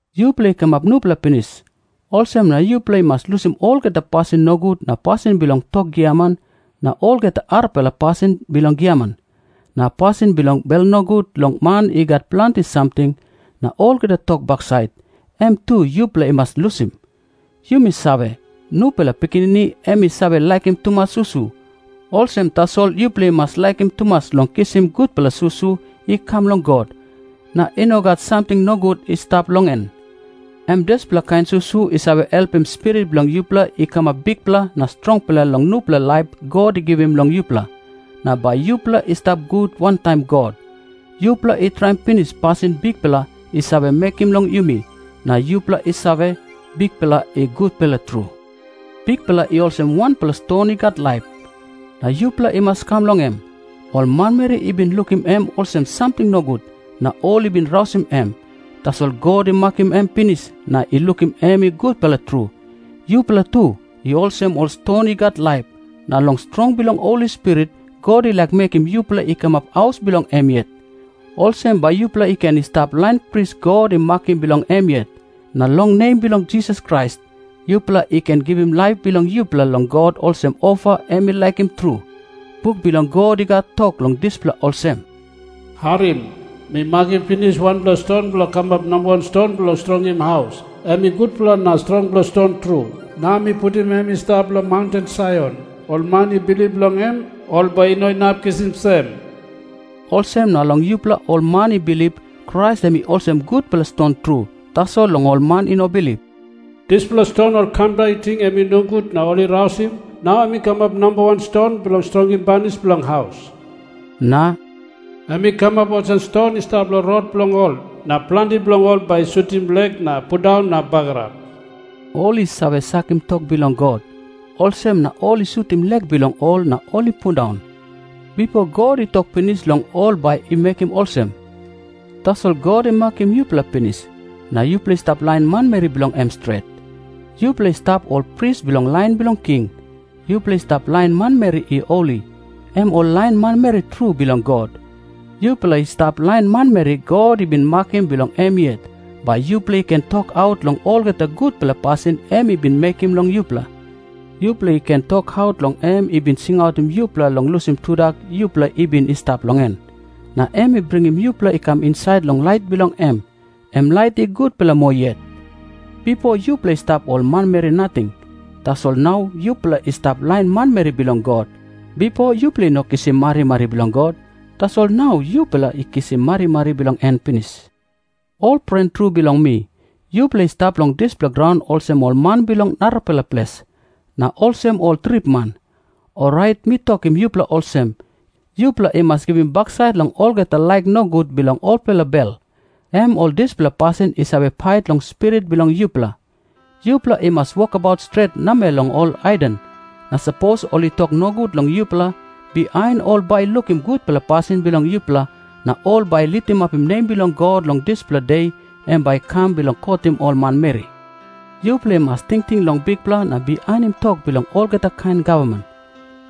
Yupela i kamap nupela pinis, olsem na yupela i mas lusim olgeta pasin nogut na pasin bilong tok giaman na olgeta arapela pasin bilong giaman. Na pasin bilong bel nogut long man i gat planti samting, na olgeta tok baksait, em tu yupela i mas lusim. Yumi save, nupela pikinini em i save laikim tumas susu. Olsem tasol yupela i mas laikim tumas long kisim gutpela susu i kam long God, na i no gat samting nogut i stap long en. Em dispela kain susu i save helpim spirit bilong yupela i kamap bikpela na strongpela long nupela laip God i givim long yupela, na bai yupela i stap gut wantaim God. Yupela i traim pinis pasin Bikpela i save mekim long yumi, na yupela i save, Bikpela i gutpela tru. Bikpela i olsem wanpela ston i gat laip, na yupela i mas i kam long em. Ol manmeri i bin lukim em olsem samting nogut, na ol i bin rausim em. Tasol God i makim em pinis na i lukim em i gutpela tru. Yupela tu i olsem ol ston i gat laip, na long strong bilong Holi Spirit God i laik mekim yupela i kamap haus bilong em yet. Olsem bai yupela i ken i stap lain pris God i makim bilong em yet, na long nem bilong Jisas Krais yupela i ken givim laip bilong yupela long God olsem ofa em i laikim tru. Buk bilong God i gat tok long dispela olsem, "Harim. Mi makim pinis wanpela ston bilong kamap namba wan ston bilong strongim haus. Em i gutpela na strongpela ston tru. Nau mi putim em i stap long maunten Saion. Ol man i bilip long em, ol bai i no inap kisim sem." Olsem na long yupela ol man i bilip, Krais em i olsem gutpela ston tru. Tasol long ol man i no bilip, "Dispela ston ol kamda i ting em i nogut na ol i rausim, nau em i kamap nambawan ston bilong strongim banis bilong haus," na "em i kamap olsem ston i stap long rot bilong ol, na planti bilong ol bai i sutim lek na pundaun na bagarap." Ol i save sakim tok bilong God, olsem na ol i sutim lek bilong ol na ol i pundaun. Bipo God i tok pinis long ol bai i mekim olsem. Tasol God i makim yupela pinis, na yupela i stap lain manmeri bilong em stret. Yupela i stap ol pris bilong lain bilong king. Yupela i stap lain manmeri i holi, em ol lain manmeri tru bilong God. Yupela i stap lain manmeri God i bin makim bilong em yet, bai yupela i ken tokaut long olgeta gutpela pasin em i bin mekim long yupela. Yupela i ken tokaut long em i bin singautim yupela long lusim tudak yupela i bin i stap long en, na em i bringim yupela i kam insait long lait bilong em, em lait i gutpela moa yet. Bipo yupela i stap ol manmeri nating. Tasol nau yupela i stap lain manmeri bilong God. Bipo yupela i no kisim marimari bilong God, tasol nau yupela i kisim marimari bilong en pinis. Ol pren tru bilong mi, yupela i stap long dispela graun olsem ol man bilong narapela ples, na olsem ol tripman. Orait mi tokim yupela olsem, yupela i mas givim baksait long olgeta laik nogut bilong olpela bel, em ol dispela pasin i save pait long spirit bilong yupela. Yupela i mas wokabaut stret namel long ol haiden. Na sapos ol i tok nogut long yupela, bihain ol bai i lukim gutpela pasin bilong yupela, na ol bai i litimapim nem bilong God long dispela de em bai i kam bilong kotim ol manmeri. Yupela i mas tingting long Bikpela na bihainim tok bilong olgeta kain gavman.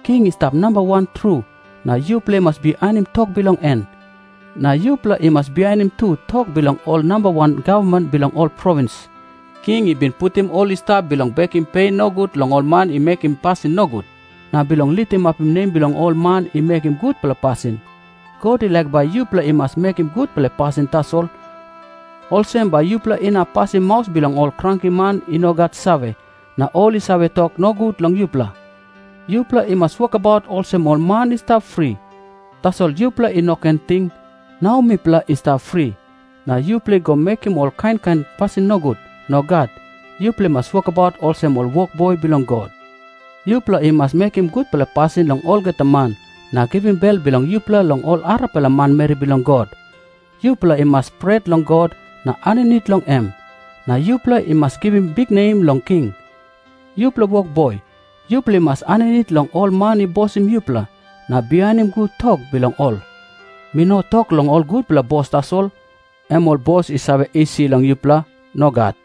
King i stap namba wan tru, na yupela i mas bihainim tok bilong en. Na yupela i mas bihainim tu tok bilong ol namba wan gavman bilong ol provins. King i bin putim ol i stap bilong bekim pe nogut long ol man i mekim pasin nogut, na bilong litimapim nem bilong ol man i mekim gutpela pasin. God i laik bai yupela i mas mekim gutpela pasin tasol, olsem bai yupela inap pasim maus bilong ol krankiman i no gat save, na ol i save tok nogut long yupela. Yupela i mas wokabaut olsem ol man i stap fri. Tasol yupela i no ken ting, "Nau mipela i stap fri," na yupela i go mekim ol kain kain pasin nogut. Nogat. Yupela i mas wokabaut olsem ol wokboi bilong God. Yupela i mas mekim gutpela pasin long olgeta man, na givim bel bilong yupela long ol arapela manmeri bilong God. Yupela i mas pret long God na aninit long em. Na yupela i mas givim biknem long king. Yupela wokboi, yupela i mas aninit long ol man i bosim yupela, na bihainim gut tok bilong ol. Mi no tok long ol gutpela bos tasol, em ol bos i save isi long yupela. Nogat.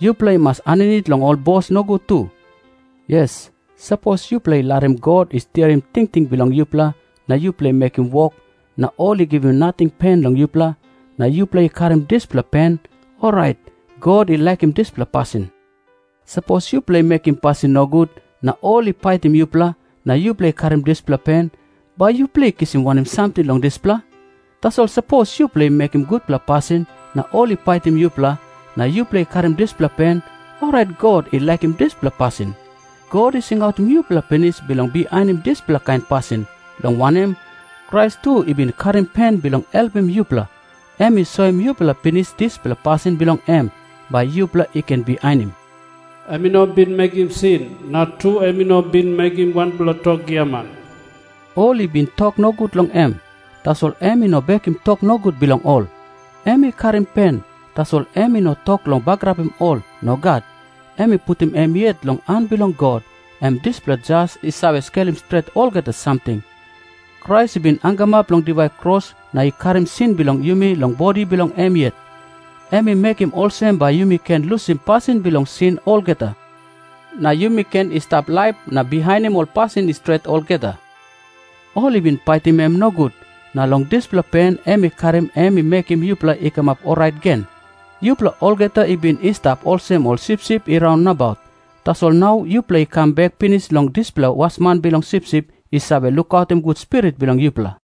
Yupela i mas aninit long ol bos nogut tu. Yes, sapos yupela i larim God i stiaim tingting bilong yupela na yupela i mekim wok, na ol i givim nating pen long yupela, na yupela i karim dispela pen, orait God i laikim dispela pasin. Sapos yupela i mekim pasin nogut na ol i paitim yupela, na yupela i karim dispela pen, bai yupela i kisim wanem samting long dispela? Tasol sapos yupela i mekim gutpela pasin na ol i paitim yupela, na yupela i karim dispela pen, orait God i laikim dispela pasin. God i singautim yupela pinis bilong bihainim dispela kain pasin, long wanem, Krais tu i bin karim pen bilong helpim yupela. Em i soim yupela pinis dispela pasin bilong em, bai yupela i ken bihainim. Em i no bin mekim sin, na tu em i no bin mekim wanpela tok giaman. Ol i bin tok nogut long em, tasol em i no bekim tok nogut bilong ol. Em i karim pen, tasol em i no tok long bagarapim ol. Nogat. Em i putim em yet long han bilong God, em dispela Jas i save skelim stret olgeta samting. Krais i bin hangamap long diwai kros na i karim sin bilong yumi long bodi bilong em yet. Em i mekim olsem bai yumi ken lusim pasin bilong sin olgeta, na yumi ken i stap laip na bihainim ol pasin i stret olgeta. Ol i bin paitim em nogut, na long dispela pen em i karim em i mekim yupela i kamap orait gen. Yupela olgeta i bin i stap olsem ol sipsip i raun nabaut. Tasol nau yupela i kam bek pinis long dispela Wasman Bilong Sipsip i save lukautim gut spirit bilong yupela.